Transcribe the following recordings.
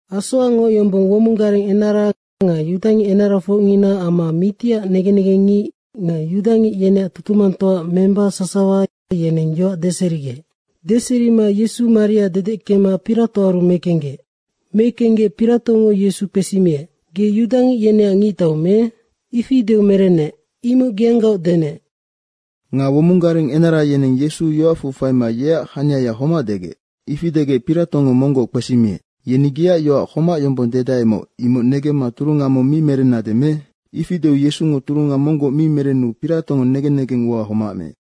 Asoacngoc yombong womong gareng enara nga yudangic enarafocngina amma mitiac negen negengngic nga yudangic yeneac tutumangtoa memba sasawa, yeneng yoac deserigec. Deserima Yesu maria dedeckema Piratoaru mekenggec. Mekenggec Piratongo Yesu kpesimiec, “Ge yudangic yeneac ngictau me?” ifi deu merenec, “Imocnoc geanggaoc denec.” Nga womong gareng enara yeneng Yesu yoacfu faima yeac haniaya homac degec. Ifi degec Piratongo monggoc kpesimiec, “Yeni geac yoac homac yombong dedaemoc, imoc negemma turunga mong mi merennade me?” Ifi deu Yesungo turunga monggoc mi merenu Piratongo negen negeng ua homac meec.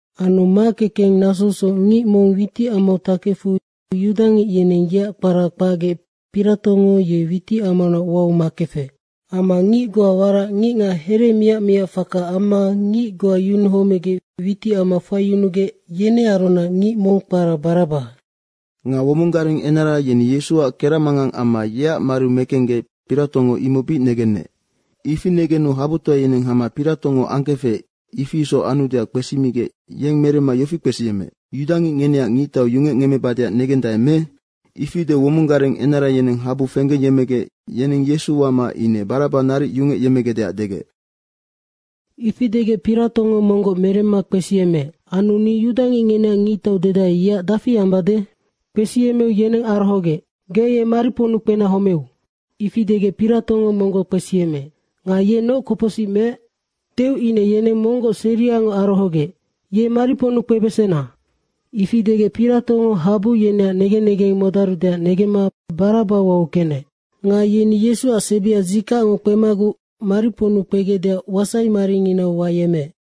Anu makekeng nasousoc ngic mong witicamau takefu yudangic yeneng yeac kpara kpacgec Piratongo yenoc witicamaunac wau makefec. Amma ngic goa warac ngicngac here miac miac faka amma ngic goa yunuhomegec witicamau faiyunugec, yenearunac ngic mong kpara Baraba. Nga womong gareng enara yeni Yesuac keracmangang amma yeac mariu mekenggec, Piratongo imoc bic negenec. Ifi negenu habutoa yeneng hama Piratongo angkefec, ifi isoc anudeac kpesimigec yeng meremma yofi kpesiyemmeec, “Yudangic ngeneac ngictau yungecngemmebadeac negendae me?” Ifi deu womong gareng enara yeneng habu fenggeyemmegec yeneng Yesu wama ine Baraba naric yungecyemmegecdeac degec. Ifi degec Piratongo monggoc meremma kpesiyemmeec, “Anu ni yudangic ngeneac ngictau dedae, yeac dafi ambade?” Kpesiyemmeu yeneng arohogec, “Ge ye mariponnu kpena homeu.” Ifi degec Piratongo monggoc kpesiyemmeec, “Nga ye noc kopocsic meec?” deu ine yeneng monggoc seriangoc arohogec, “Ye mariponnu kpebesena.” Ifi degec Piratongo habu yeneac negen negeng modarudeac negemma Baraba wau kenec. Nga yeni Yesuac sebia dzikacngo kpemaguc mariponnu kpegecdeac wasai maringinau wayemmeec.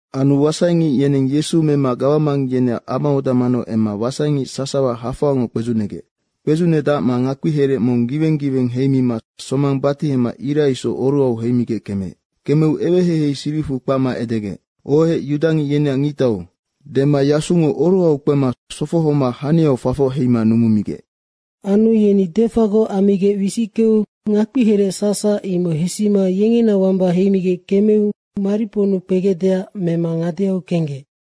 Anu wasaingic yeneng Yesu mema gawamang yeneac amaoda manau emma wasaingic sasawa hafoangoc kpedzucnegec. Kpedzucnedacma ngakpiherec mong giweng giweng heimima somang batihema ira isoc oruhau heimigec kemeec. Kemeu eweheihei siricfu kpacma edegec, “Ohec, yudangic yeneac ngictau.” Dema yasungo oruhau kpema sofohoma haniau fafoc heima numumigec. Anu yeni defagoc ammigec wisickeu ngakpiherec sacsac imoc hesima yengena wamba heimigec kemeu mariponnu kpegecdeac mema ngadeau kenggec.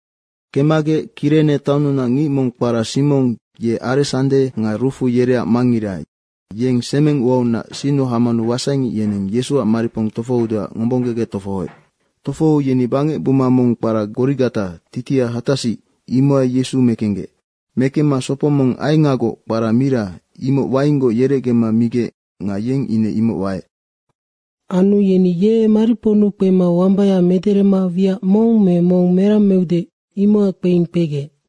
Kemmagec Kirene taonnunac ngic mong kpara Simong, ye Aresande nga Rufu yereac mangngira, yeng semeng uaunac sinnu hamanu wasaingic yeneng Yesuac maripong tofohoudeac ngombonggegec tofohoec. Tofohou yeni bangec buma mong kpara Gorigata, titiha hatasic, imohai Yesu mekenggec. Mekemma sopo mong aengagoc kpara mira, imoc wainggoc yerecgema migec nga yeng ine imoc waec. Anu yeni ye mariponnu kpema wambaya mederema wiac mong me mong merang meude, imocac kpeing kpegec.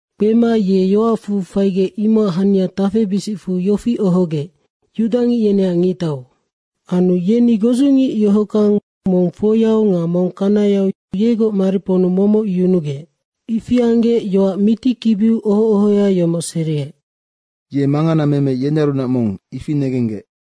Kpema ye yoacfu faigec, imocac hania tafebisicfu yofi ohogec, “Yudangic yeneac ngictau.” Anu yeni godzungic yohockang, mong foiau nga mong kanayau yegoc mariponnu momoc yunugec. Ifi anggec yoac mitikibiu oho ohoya yomoc seriec, “Ye manganameme yenearunac mong, ifi negenggec.”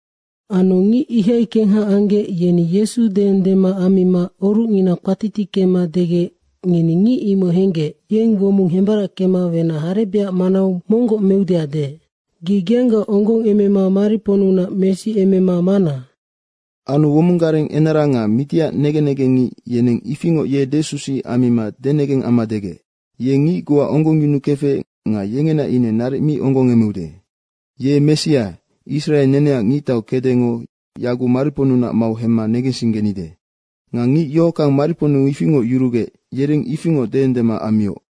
Anu ngic ihai kengha anggec, yeni Yesu deendema ammima orucngina kpatitickema degec, “Ngeni ngic imoc henggec, yeng womong hembarackema wenac harebecac manau monggoc meudeac deec. Ge geanggaoc onggongemema mariponnunac mesiemema mana!” Anu womong gareng enara nga mitiac negen negengngic, yeneng ifingoc ye desusuic ammima denegeng amma degec, “Ye ngic goa onggongyunukefec nga yengena ine naric mi onggongemeude. Ye Messia, Israe neneac ngictau kecdengo yaguc mariponnunac mau hemma negensinggenide.” Nga ngic yohockang mariponnu ifingoc yurugec, yereng ifingoc deendema ammioc.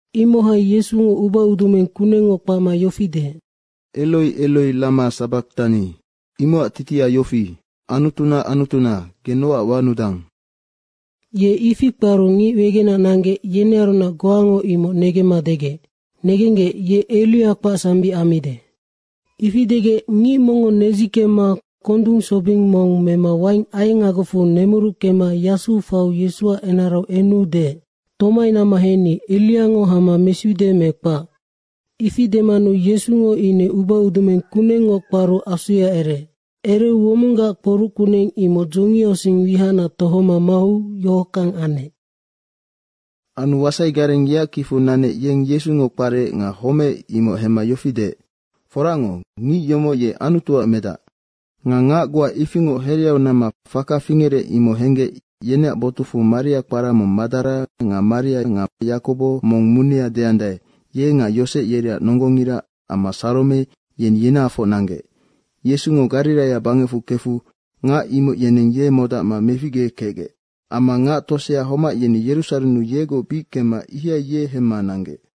Imohai Yesungo ubaudumeng kunengngoc kpacma yofi deec, “Eroi, Eroi rama sabaktani.” Imocac titiha yofi, “Anutuna Anutuna, ge nocac wanudang.” Ye ifi kparu ngic wegenac nanggec, yenearunac goango imoc negemma degec, “Negenggec, ye Eria kpacsambic ammide.” Ifi degec ngic mongngo nedzikemma kondung sobing mong mema waing aengagocfu nemuruckema yasuu faiu Yesuac enarau enu deec, “Tomai namma henni, Eriango hama mesiude me kpac!” Ifi demanu Yesungo ine ubaudumeng kunengngoc kparu asuya ereec. Ereu womonggac kporuc kuneng imoc dzongiausing wihacnac tohoma mau yohockang anec. Anu wasaigareng yeac kicfu nanec, yeng Yesungo kparec nga homeec, imoc hemma yofi deec, “Foracngoc, ngic yomoc ye Anutuac medacnoc.” Nga ngac goa ifingoc hereau namma faka fingerec, imoc henggec, yeneac botucfu Maria kpara mong Madara nga Maria, Yakobo mong munea deandae, ye nga Yosec yereac nonggongira amma Sarome, yeni yenahafoc nanggec. Yesungo Gariraia bangecfu kefu ngac imoc yenennoc ye modacma meficgekecgec. Amma ngac tosea homac, yeni Yerusarennu yegoc bic kemma ihai ye hemma nanggec.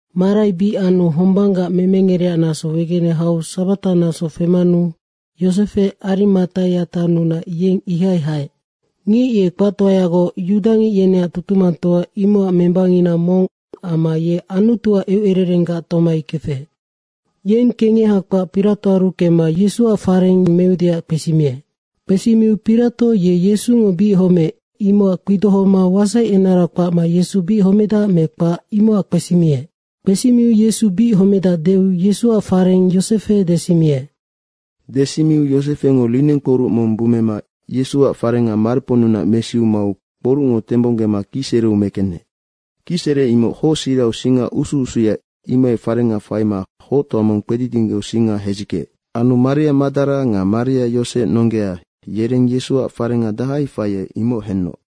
Marai bic anu hombanggac memengereac naso wegene hau sabataac naso femanu Yosefe Arimataia taonnunac, yeng ihai haec. Ngic ye kpactoayagoc yudangic yeneac tutumangtoa, imocac membangina mong amma ye Anutuac eucererenggac tomai kefec. Yeng kengeha kpac Piratoaru kemma Yesuac fareng meudeac kpesimiec. Kpesimiu Pirato ye Yesungo bic homeec, imocac kpidohoma wasaienara kpacma Yesu bic homedac me kpac, imocac kpesimiec. Kpesimiu Yesu bic homedac deu Yesuac fareng Yosefe desimiec. Desimiu Yosefengo linengkporuc mong bummema Yesuac farenga mariponnunac mesiu mau kporucngo tembonggema kicsereu mekenec. Kicsere imoc hocsirau singa usu usuya, imohai farenga faima hoctoa mong kpedidinggeu singa hedzickeec. Anu Maria Madara nga Maria Yosec nonggea, yereng Yesuac farenga dahai faiec, imoc henoc.